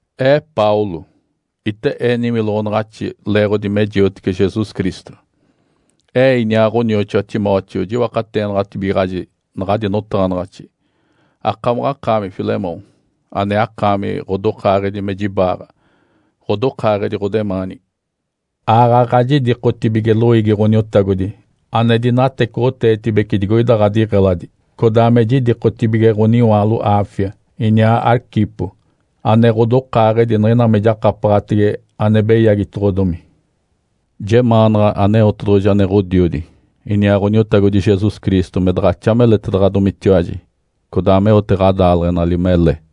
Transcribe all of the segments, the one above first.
Ee Paulo, ite ee niwiloɡ̶onaɡ̶axi leeɡ̶odi me jiotece Jesus Cristo. Ee iniaa ɡ̶onioxoa Timóteo jiwakateenaɡ̶atibigaɡ̶aji naɡ̶adi notaɡ̶anaɡ̶axi, akamaɡ̶akaami, Filemom ane akaami ɡ̶odokaaɡ̶edi me jibaaɡ̶a, ɡ̶odokaaɡ̶edi ɡ̶odemaanigi. Aaɡ̶aɡ̶a jidikotibige loiigi Ǥoniotagodi ane dinatecoɡ̶oteetibece digoida ɡ̶adiɡ̶eladi, codaa me jidikotibige ɡ̶oniwaalo Áfia, iniaa Arquipo ane ɡ̶odokaaɡ̶edi niɡ̶ina me jakapaɡ̶atege ane beyagitedoɡ̶odomi. Jemaanaɡ̶a Aneotedoɡ̶oji ane Ǥodiodi, iniaa Ǥoniotagodi Jesus Cristo me daɡ̶axa meletaɡ̶adomitiwaji, codaa meote ɡ̶adaaleɡ̶enali mele.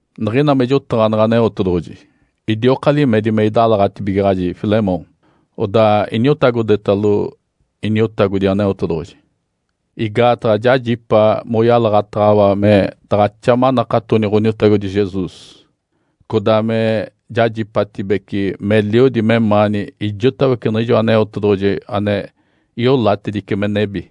Niɡ̶ina me jotaɡ̶aneɡ̶e Aneotedoɡ̶oji, idioka limedi me idalaɡ̶atibigaɡ̶aji Filemom, odaa iniotagodetalo Iniotagodi Aneotedoɡ̶oji. Igaataɡ̶a jajipa moyalaɡ̶ataɡ̶awa me daɡ̶axa manakatoni Ǥoniotagodi Jesus, codaa me jajipatibece meliodi memaani ijotawece niɡ̶ijo Aneotedoɡ̶oji ane iolatedice me nebi.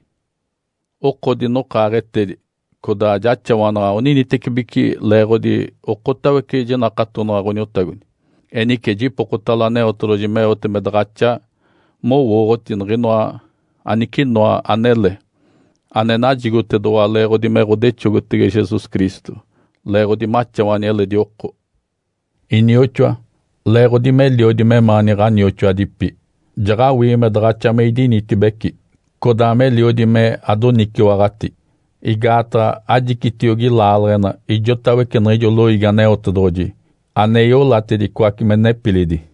Oko dinokaaɡ̶etedi, codaa jaxawanaɡ̶a oninitecibeci leeɡ̶odi okotawece jinakatonaɡ̶a Ǥoniotagodi. Enice jipokotalo Aneotedoɡ̶oji meote me daɡ̶axa mowooɡ̶oti niɡ̶inoa anicinoa anele ane najigotedoɡ̶owa leeɡ̶odi me ɡ̶odexogotege Jesus Cristo, leeɡ̶odi maxawani eledi oko. Inioxoa, leeɡ̶odi meliodi memaani ɡ̶anioxoadipi, jaɡ̶awii me daɡ̶axa me idinitibeci codaa meliodi me adoniciwaɡ̶ati, igaataɡ̶a ajicitiogi laaleɡ̶ena ijotawece niɡ̶ijo loiigi Aneotedoɡ̶oji ane iolatedicoace me nepilidi.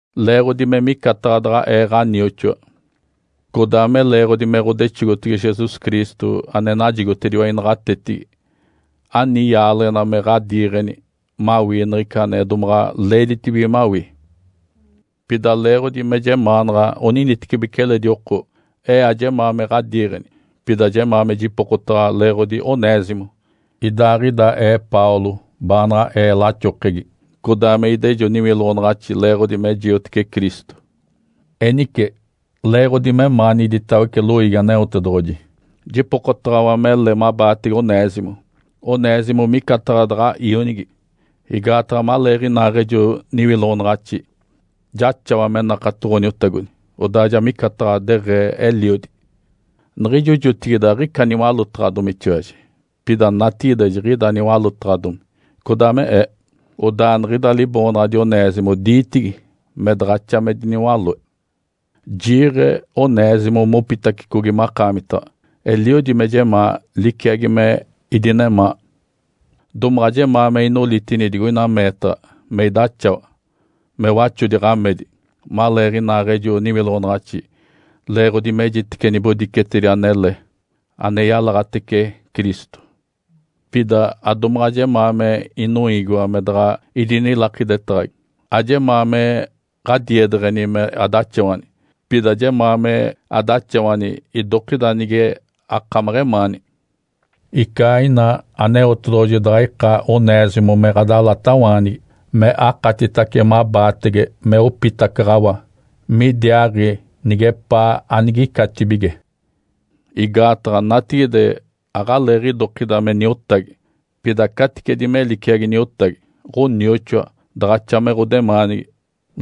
Leeɡ̶odi me micataɡ̶a daɡ̶a ee ɡ̶anioxoa, codaa me leeɡ̶odi me ɡ̶odexogotege Jesus Cristo ane najigotediwa inaɡ̶atetigi, ani yaaleɡ̶ena me ɡ̶adiiɡ̶eni mawii niɡ̶ica ane domaɡ̶a leeditibige mawii. Pida leeɡ̶odi me jemaanaɡ̶a oninitecibeci eledi oko, ee ajemaa me ɡ̶adiiɡ̶eni, pida jemaa me jipokotaɡ̶awa leeɡ̶odi Onésimo, idaaɡ̶ida ee Paulo baanaɡ̶a ee laxokegi, codaa me idejo niwiloɡ̶onaɡ̶axi leeɡ̶odi me jiotece Cristo. Enice, leeɡ̶odi memaani iditawece loiigi Aneotedoɡ̶oji, jipokotaɡ̶awa mele mabaatege Onésimo. Onésimo micataɡ̶a daɡ̶a ionigi, igaataɡ̶a maleeɡ̶inaaɡ̶ejo niwiloɡ̶onaɡ̶axi jaxawa me nakato Ǥoniotagodi, odaa ja micataɡ̶a deɡ̶ee eliodi. Niɡ̶ijo jotigide, aɡ̶ica niwalótaɡ̶adomitiwaji, pida natigide jiɡ̶ida niwalótaɡ̶adomi codaa me ee. (Odaa niɡ̶ida liboonaɡ̶adi Onésimo diitigi me daɡ̶axa me diniwaloe.) Jiiɡ̶e Onésimo mopitacicogi makaamita. Eliodi me jemaa liciagi me idinemaa. Domaɡ̶a jemaa me inolitini digoina meetaɡ̶a me idaxawa me waxodi ɡ̶amedi maleeɡ̶inaaɡ̶ejo niwiloɡ̶onaɡ̶axi leeɡ̶odi mejitece nibodicetedi anele ane yalaɡ̶atece Cristo. Pida adomaɡ̶a jemaa me inoiigiwa me daɡ̶a idinilakidetaɡ̶agi. Ajemaa me ɡ̶adiedeɡ̶eni me adaxawani, pida jemaa me adaxawani idokida nige akamaɡ̶emaani. Ica ina Aneotedoɡ̶oji daɡ̶a ika Onésimo me ɡ̶adalatawaanigi me akatitace mabaatege me opitacaɡ̶awa midiaaɡ̶i nigepaa anigicatibige. Igaataɡ̶a natigide aɡ̶aleeɡ̶idokida me niotagi, pida caticedi me liciagi niotagi, ɡ̶onioxoa daɡ̶axa me ɡ̶odemaanigi,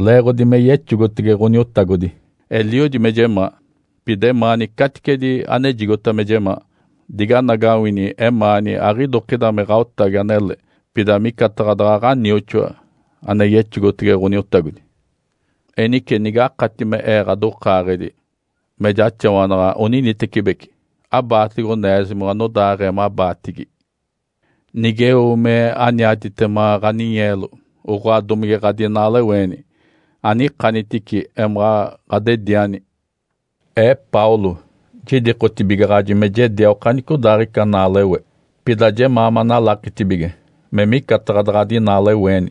leeɡ̶odi me yexogotege Ǥoniotagodi. Eliodi me jemaa, pida emaani caticedi anejigota me jemaa. Diganagawini emaani aɡ̶idokida me ɡ̶aotagi anele, pida micataɡ̶a daɡ̶a ɡ̶anioxoa, ane yexogotege Ǥoniotagodi. Enice nigakati me ee ɡ̶adokaaɡ̶edi, me jaxawanaɡ̶a oninitecibeci, abaatege Onésimo anodaaɡ̶ee mabaatigi. Nigeo me aniatitema ɡ̶aninyeelo, oɡ̶oa domige ɡ̶adinaaleweeni, anikanitici emaɡ̶a ɡ̶adediani. Ee Paulo jidikotibigaɡ̶aji me jedia okanicodaaɡ̶ica naalewe. Pida jemaa manalakitibige me micataɡ̶a daɡ̶a adinaaleweeni,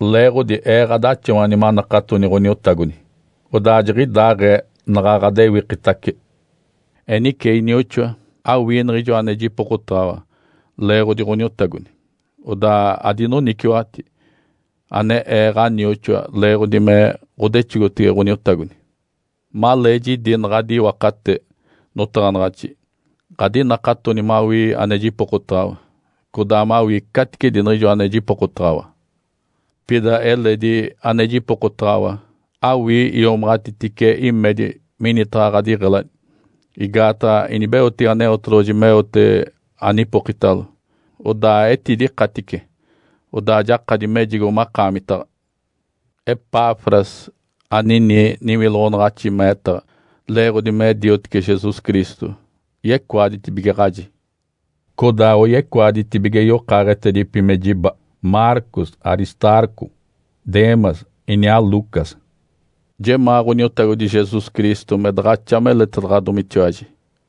leeɡ̶odi ee ɡ̶adaxawani manakatoni Ǥoniotagodi, odaa jiɡ̶idaaɡ̶ee naɡ̶a ɡ̶adewikitace. Enice, inioxoa, awii niɡ̶ijo ane jipokotaɡ̶awa leeɡ̶odi Ǥoniotagodi, odaa adoniciwaɡ̶ati, ane ee ɡ̶anioxoa leeɡ̶odi me ɡ̶odexogotege Ǥoniotagodi. Malee jidi naɡ̶adi iwakate notaɡ̶anaɡ̶axi, ɡ̶adinakatoni mawii ane jipokotaɡ̶awa, codaa mawii caticedi niɡ̶ijo ane jipokotaɡ̶awa. Pida eledi ane jipokotaɡ̶awa. Awii iomaɡ̶atitice imedi minitaɡ̶a ɡ̶adiɡ̶eladi, igaataɡ̶a inibeotege Aneotedoɡ̶oji meote anipokitalo, odaa etidikatice, odaa jakadi mejigo makaamitaɡ̶a. Epafras, anini niwiloɡ̶onaɡ̶axi meetaɡ̶a leeɡ̶odi me diotece Jesus Cristo, yecoaditibigaɡ̶aji. Codaa oyecoaditibige yokaaɡ̶etedipi me jiba, Marcos, Aristarco, Demas iniaa Lucas. Jemaa Ǥoniotagodi Jesus Cristo me daɡ̶axa meletedaɡ̶adomitiwaji.